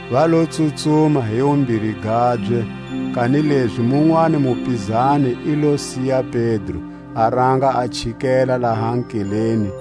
Va lo tsutsuma hi wumbiri gabye; kanilezi munwani mupizani i lo siya Pedro, a ranga a chikela laha nkeleni;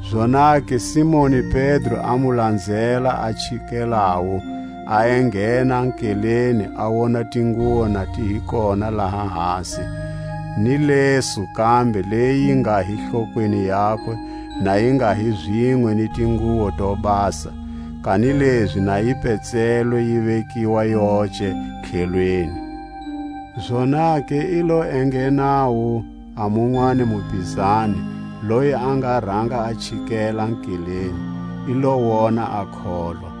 Zonake Simoni Pedro a mu lanzela a chikelawu, a enghena nkeleni, a wona tinguwo na ti hi kona laha hasi, ni lesu kambe leyi yi nga hi hlokweni yakwe, na yi nga hi zinwe ni tinguwo to basa, kanilezi na yi petsilwe yi vekiwa yoce tlhelweni. Zonake i lo enghenawu a munwani mupizani, loyi a nga ranga a chikela nkeleni, i lo wona a kholwa.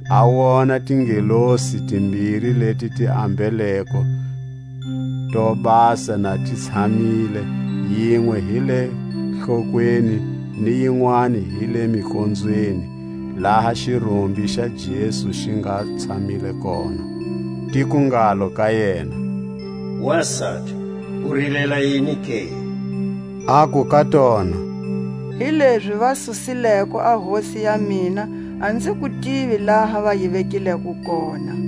a wona tingelosi timbiri leti ti ambeleko to basa na ti tshamile, yinwe hi le hlokweni, ni yinwani hi le mikonzweni, laha xirumbi xa Jesu xi nga tshamile kona. Ti ku ngalo ka yena: Wasati, u rilela yini ke? Aku ka tona; Hilezi va susileko a Hosi ya mina, a nzi ku tivi laha va yi vekileko kona.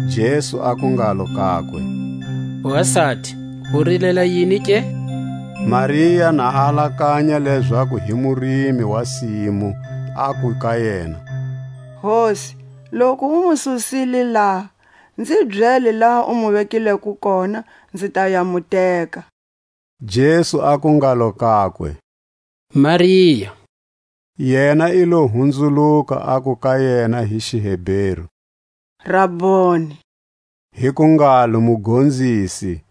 Jesu aku ngalo kakwe: Wasati, u rilela yini ke? Maria na a alakanya lezaku hi murimi wa simu, aku ka yena: Hosi, loku u mu susile laha, nzi byele laha u mu vekileko kona, nzi ta ya mu teka. Jesu aku ngalo kakwe: Maria! Yena i lo hunzuluka, aku ka yena hi xiHeberu: Raboni; hi ku ngalo: Mugonzisi.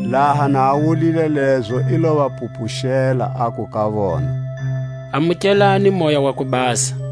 Laha na a wulile lezo, i lo va pupuxela, aku ka vona: Amukelani Moya wa ku Basa.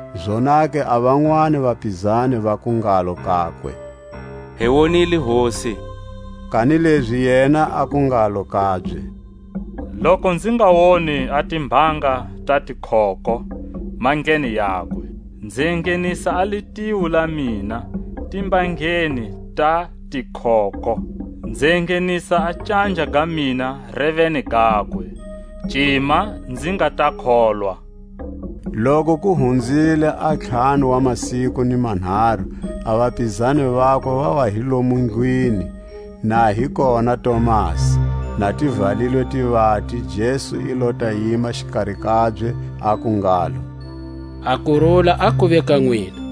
Zonake a vanwani vapizani vaku ngalo kakwe: Hi wonile Hosi. Kanilezi yena aku ngalo kabye: Loku nzi nga woni a timbanga ta tikhokho mandleni yakwe, nzi enghenisa a litiho la mina timbangeni ta tikhokho, nzi enghenisa a canja ga mina reveni gakwe, cima nzi nga ta kholwa. Loku ku hunzile a ntlhanu wa masiku ni manharu, a vapizani vakwe va wa hi lomo ndlwini, na hi kona Tomasi. Na ti valilwe tivati, Jesu i lo ta yima xikari kabye, aku ngalo: A kurula a kuve ka nwina.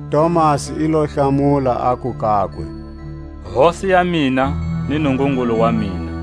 Tomasi i lo hlamula, aku kakwe: Hosi ya mina ni Nungungulu wa mina.